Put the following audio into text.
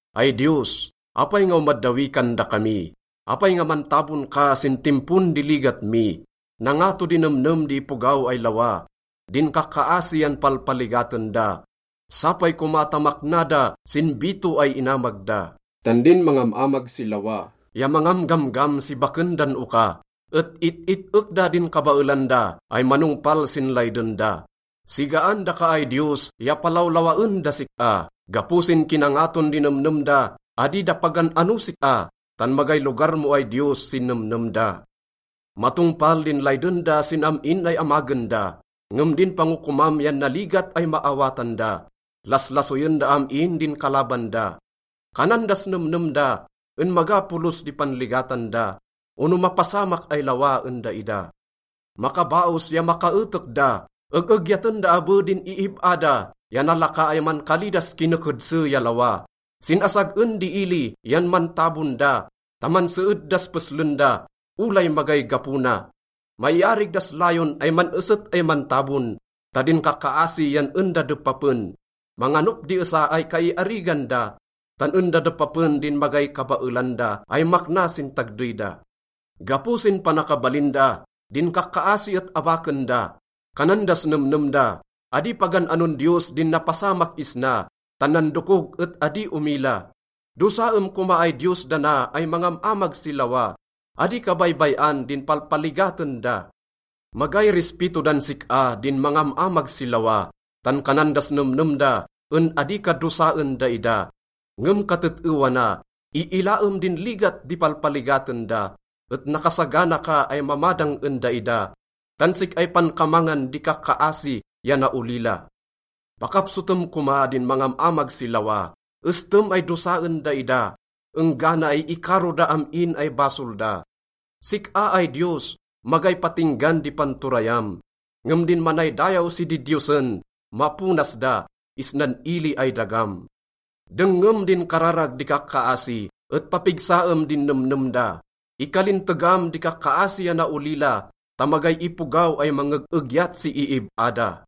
Ay Diyos, apay nga omaddawi kan dakami? Apay nga mantabon ka sin timpon di ligat mi? Nangato di nemnem di ipogaw ay lawa, din kakkaasi yan palpaligaten da. Sapay koma ta makna da sin bito ay inamag da. Tan din mangam-amag si lawa ya mangamgamgam si baken dan oka et it-it-ek da din kabaelan da ay manongpal sin layden da. Sigaan daka ay Diyos ya palawlawaen das sik-a. Gapo sin kinangaton di nemnem da, adi da pagan-anos sik-a, tan magay lugar mo ay Diyos sin nemnem da. Matongpal din layden da sin am-in ay amagen da, ngem din pangokomam yan naligat ay maawatan da, laslasoyen da am-in din kalaban da. Kanan das nemnem da en maga polos di panligatan da ono mapasamak ay lawa en daida. Makabaos ya makaetek da. Eg-egyaten da abe din iib-a da ya nalaka ay mankali das kinekedse ya lawa. Sin asag-en di ili yan mantabon da ta manseed das peslen da, olay magay gapo na. Maiarig das layon ay man-eset ay mantabon, ta din kakkaasi yan en da depapen. Manganop di esa ay kaiarigan da, tan en da depapen din magay kabaelan da ay makna sin tagdey da. Gapo sin panakabalin da, din kakkaasi et abaken da. Kanan das nemnem da, “Adi pagan-anon Diyos din napasamak isna, tan nandokog et adi omila.” Dosaem koma ay Diyos dana ay mangam-amag si lawa, adi ka baybay-an din palpaligaten da. Magay rispito dan sik-a din mangam-amag si lawa, tan kanan das nemnem da en adi ka dosaen daida. Ngem katet-ewa na, iilaem din ligat di palpaligaten da, et nakasagana ka ay mamadang en daida, tan sik-ay pankamangan di kakkaasi ya naolila. Pakapsotem koma din mangam-amag si lawa, estem ay dosaen daida enggana ay ikaro da am-in ay basol da. Sik-a ay Diyos, magay patinggan di panturayam, ngem din manaydayaw si didiyosen, maponas da isnan ili ay dagam. Dengngem din kararag di kakkaasi et papigsaem din nemnem da. Ikalintegam di kakkaasi ya naolila ta magay ipogaw ay mangeg-egyat si iib-a da.